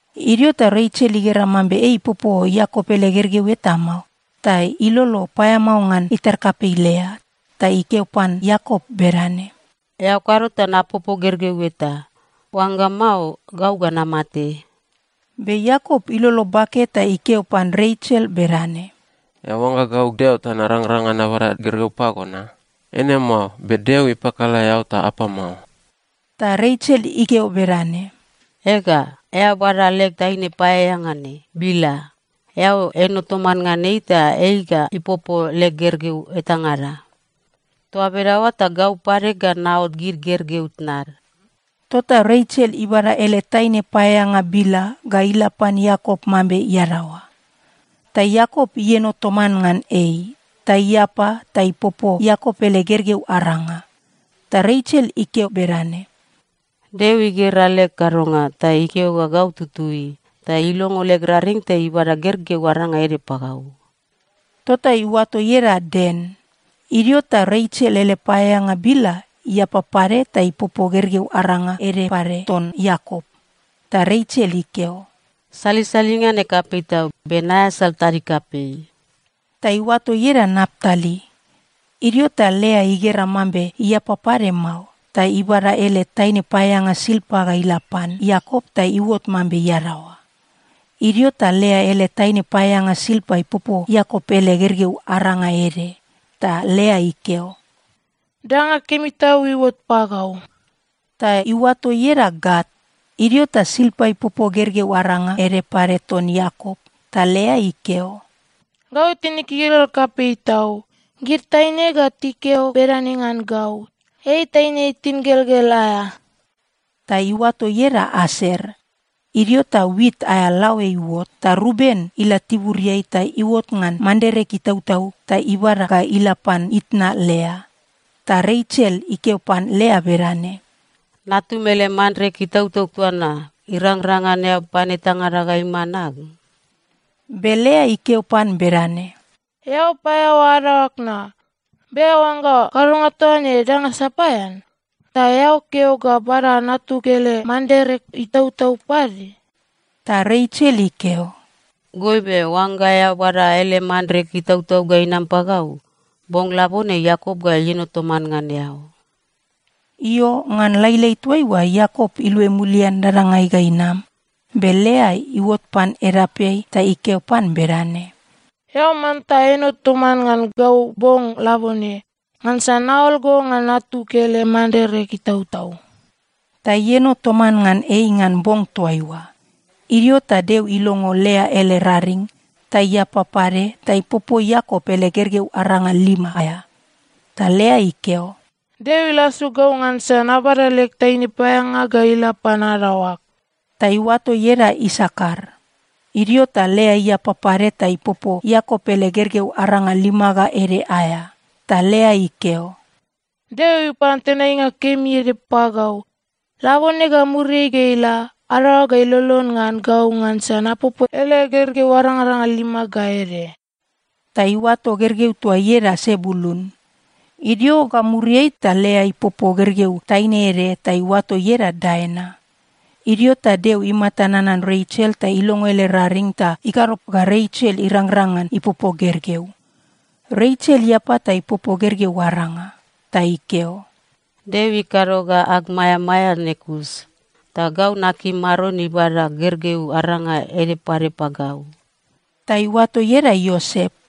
Idio ta Resel igera mambe ei ipopo Iakop ele gergeu eta mao, ta ilolo paeamao ngan itar kapei Lea. Ta ikeo pan Iakop bedane, “Eao kado ta napopo gergeu eta! Oangga mao, gau ga namate.” Be Iakop ilolo bake ta ikeo pan Resel bedane, “Eao oangga gau Deo ta narangrang ngan nabada gergeu pago na? Eine mao, be Deo ipakala eao ta apam mao.” Ta Resel ikeo bedane, “Ega, eao bada leg taine paeaeanga ne, Bila. Eao eno toman ngan ei ta ei ga ipopo leg gergeu etangada. Toa bedaoa ta gau pade ga naot gid gergeu tnad.” Tota Resel ibada ele taine paeaeanga Bila ga ila pan Iakop mambe iadaoa. Ta Iakop ieno toman ngan ei, ta iapa ta ipopo Iakop ele gergeu aranga. Ta Resel ikeo bedane, “Deo igera leg kadonga, ta ikeo ga gau tutui. Ta ilongo leg raring ta ibada gergeu aranga ede pagau.” Tota iuato ieda Dan. Idio ta Resel ele paeaeanga Bila iapa pade ta ipopo gergeu aranga ede pade ton Iakop. Ta Resel ikeo, “Salisalinga ne kapei tau, be naeasal tadig kapei.” Ta iuato ieda Naptali. Idio ta Lea igera mambe iapa pade mao, ta ibada ele taine paeaeanga Silpa ga ila pan Iakop ta iuot mambe iadaoa. Idio ta Lea ele taine paeaeanga Silpa ipopo Iakop ele gergeu aranga ede. Ta Lea ikeo, “Danga kemi tau iuot pagau.” Ta iuato ieda Gat. Idio ta Silpa ipopo gergeu aranga ede pade ton Iakop. Ta Lea ikeo, “Gau tinig igelgel kapei tau. Gid taine ga tikeo bedane ngan gau, ‘Ei taine tingelgel aea.’” Ta iuato ieda Aser. Idio ta wit aea laoe iuot, ta Ruben ila tiburiai ta iuot ngan manderek itautau ta ibada ga ila pan itna Lea. Ta Resel ikeo pan Lea bedane, “Natum ele manderek itautau toa na, irangrang ngan eao pan etangada ga iman ag?” Be Lea ikeo pan bedane, “Eao paeaoa adaoag na. Be eao oangga kadonga toa ne danga sapaean? Ta eao keo ga bada natug ele manderek itautau pade?” Ta Resel ikeo, “Goibe, oangga eao bada ele manderek itautau ga inam pagau, bong labone Iakop ga ieno toman ngan eao.” Io, ngan lailai toaiua Iakop iluai mulian dadangai ga inam, be Lea iuot pan edapeai ta ikeo pan bedane, “Eao manta eno toman ngan gau bong labone, ngansa naol go ngan natug ele manderek itautau.” Ta ieno toman ngan ei ngan bong toaiua. Idio ta Deo ilongo Lea ele raring, ta iapa pade ta ipopo Iakop ele gergeu aranga lima aea. Ta Lea ikeo, “Deo ilasu gau ngansa nabada leg taine paeaeanga ga ila pan adaoag.” Ta iuato ieda Isakar. Idio ta Lea iapa pade ta ipopo Iakop ele gergeu aranga lima ga ede aea. Ta Lea ikeo, “Deo ipan tenainga kemi ede pagau. Labone ga muriai ga ila, adaoag ga ilolon ngan gau ngansa napopo ele gergeu arangaranga lima ga ede.” Ta iuato gergeu toa ieda Sebulun. Idio ga muriai ta Lea ipopo gergeu taine ede ta iuato ieda Daina. Idio ta Deo imata nanan Resel ta ilongo ele raring ta ikado ga Resel irangrang ngan ipopo gergeu. Resel iapa ta ipopo gergeu aranga. Ta ikeo, “Deo ikado ga ag maeamaea ne kus. Ta gau nakim Maron ibada gergeu aranga ede pade pagau.” Ta iuato ieda Iosep.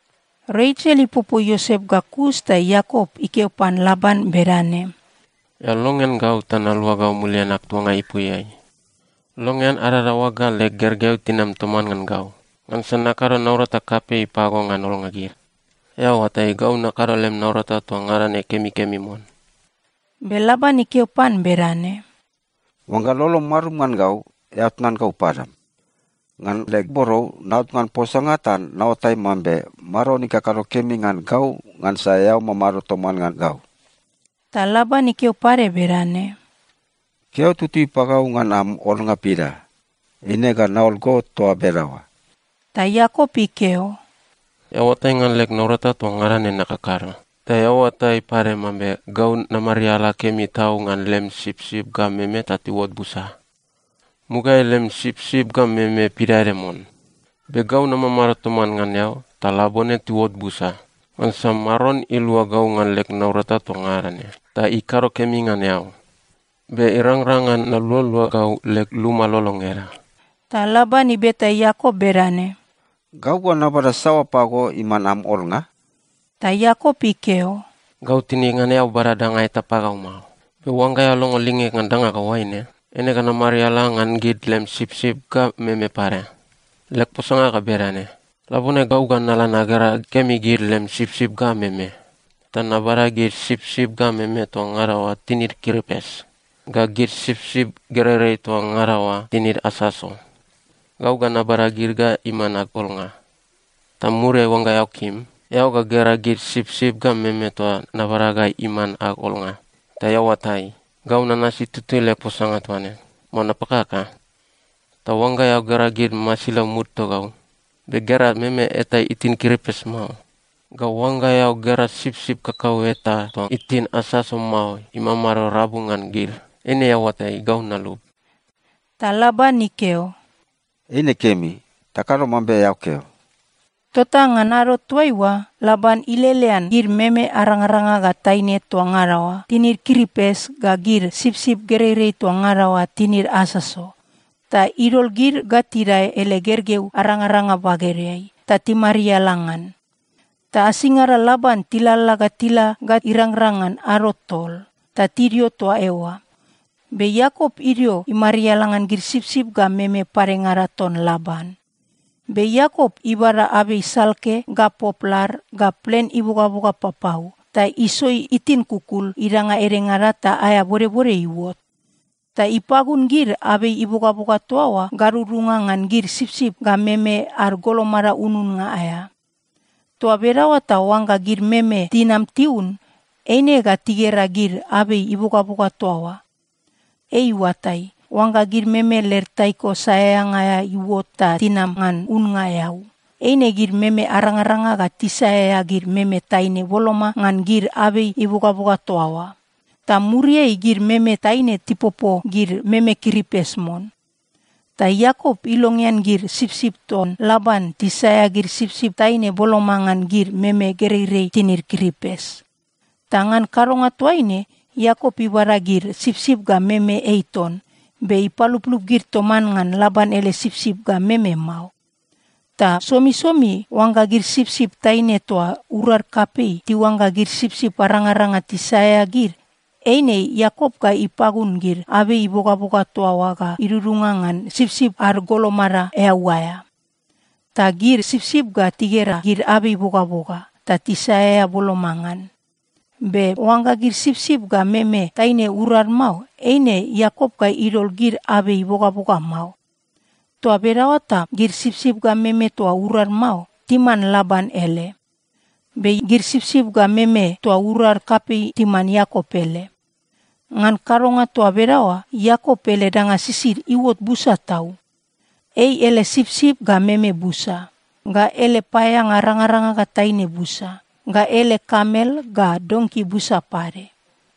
Resel ipopo Iosep ga kus ta Iakop ikeo pan Laban bedane, “Eao longean gau ta naluagau mulian ag tuanga ipuiai. Longean adadaoag ga leg gergeu tinam toman ngan gau, ngansa nakado naurata kapei pago ngan olnga gid. Eao oatai, gau nakado lem naurata toa ngada ne kemikemi mon.” Be Laban ikeo pan bedane, “Oangga lolom marum ngan gau, eao tnan gau padam. Ngan leg borou, naot ngan posanga ta naoatai mambe Maron ikado kemi ngan gau ngansa eao mamado toman ngan gau.” Ta Laban ikeo pade bedane, “Keo tutui pagau ngan am olnga pida. Eine ga naol go toa bedaoa.” Ta Iakop ikeo, “Eao oatai ngan leg naurata toa ngada ne nakakado. Ta eao oatai pade mambe gau namariala kemi tau ngan lem sipsip ga meme ta tiuot busa. Mugaeai lem sipsip ga meme pidaede mon. Be gau namamado toman ngan eao, ta labone tiuot busa, ngansa Maron ilua gau ngan leg naurata toa ngada ne, ta ikado kemi ngan eao. Be irangrang ngan nalualua gau leg luma lolo ngeda?” Ta Laban ibeta Iakop bedane, “Gau ga nabada saoa pago iman am olnga?” Ta Iakop ikeo, “Gau tinig ngan eao bada danga eta pagau mao. Be oangga eao longo lingeg ngan danga ga oaine, eine ga namariala ngan gid lem sipsip ga meme pade. Leg posanga ga bedane: Labone gau ga nala nagera kemi gid lem sipsip ga meme, ta nabada gid sipsip ga meme toa ngada oa tinid kiripes ga gid sipsip gereirei toa ngada oa tinid asaso. Gau ga nabada gid ga iman ag olnga. Ta muriai, oangga eao kim, eao ga gera gid sipsip ga meme toa nabada ga iman ag olnga, ta eao oatai, gau nanasi tutui leg posanga toa ne, mao napakaka. Ta oangga eao gera gid masilau mud togau, be gera meme eta itin kiripes mao, ga oangga eao gera sipsip kakaueta toa itin asaso mao imamado rabu ngan gid, eine eao oatai, gau nalub.” Ta Laban ikeo, “Eine kemi. Takado mambe eao keo.” Tota ngan ado toaiua, Laban ilelean gid meme arangaranga ga taine toa ngada oa tinid kiripes, ga gid sipsip gereirei toa ngada oa tinid asaso, ta idol gid ga tidae ele gergeu arangaranga bagedeai, ta timariala ngan. Ta asingada Laban tilalala ga tila ga irangrang ngan ado tol, ta tidio toa eoa. Be Iakop idio imariala ngan gid sipsip ga meme padengada ton Laban. Be Iakop ibada abei salke ga poplar ga plen ibogaboga papau, ta isoi itin kukul idanga edengada ta aea bodbode iuot. Ta ipagun gid abei ibogaboga toa oa gadudunga ngan gid sipsip ga meme ad golomada ununnga aea. Toa bedaoa ta oangga gid meme tinam tiun, eine ga tigera gid abei ibogaboga toa oa. Ei iuatai, oangga gid meme led taiko saeaeanga aea iuot ta tinam ngan unnga eau, eine gid meme arangaranga ga tisaeaea gid meme taine boloma ngan gid abei ibogaboga toa oa. Ta muriai gid meme taine tipopo gid meme kiripes mon. Ta Iakop ilongean gid sipsip ton Laban tisaeaea gid sipsip taine boloma ngan gid meme gereirei tinid kiripes. Ta ngan kadonga toaine, Iakop ibada gid sipsip ga meme ei ton, be ipaluplup gid toman ngan Laban ele sipsip ga meme mao. Ta somisomi oangga gid sipsip taine toa urad kapei tiuangga gid sipsip arangaranga tisaeaea gid, eine Iakop ga ipagun gid abei ibogaboga toa oa ga idudunga ngan sipsip ad golomada eau aea. Ta gid sipsip ga tigera gid abei ibogaboga, ta tisaeaea boloma ngan. Be oangga gid sipsip ga meme taine urad mao, eine Iakop ga idol gid abei ibogaboga mao. Toa bedaoa ta gid sipsip ga meme toa urad mao, timan Laban ele, be gid sipsip ga meme toa urad kapei timan Iakop ele. Ngan kadonga toa bedaoa, Iakop ele danga sisid iuot busa tau. Ei ele sipsip ga meme busa, ga ele paeaeanga arangaranga ga taine busa, ga ele kamel ga donki busa pade.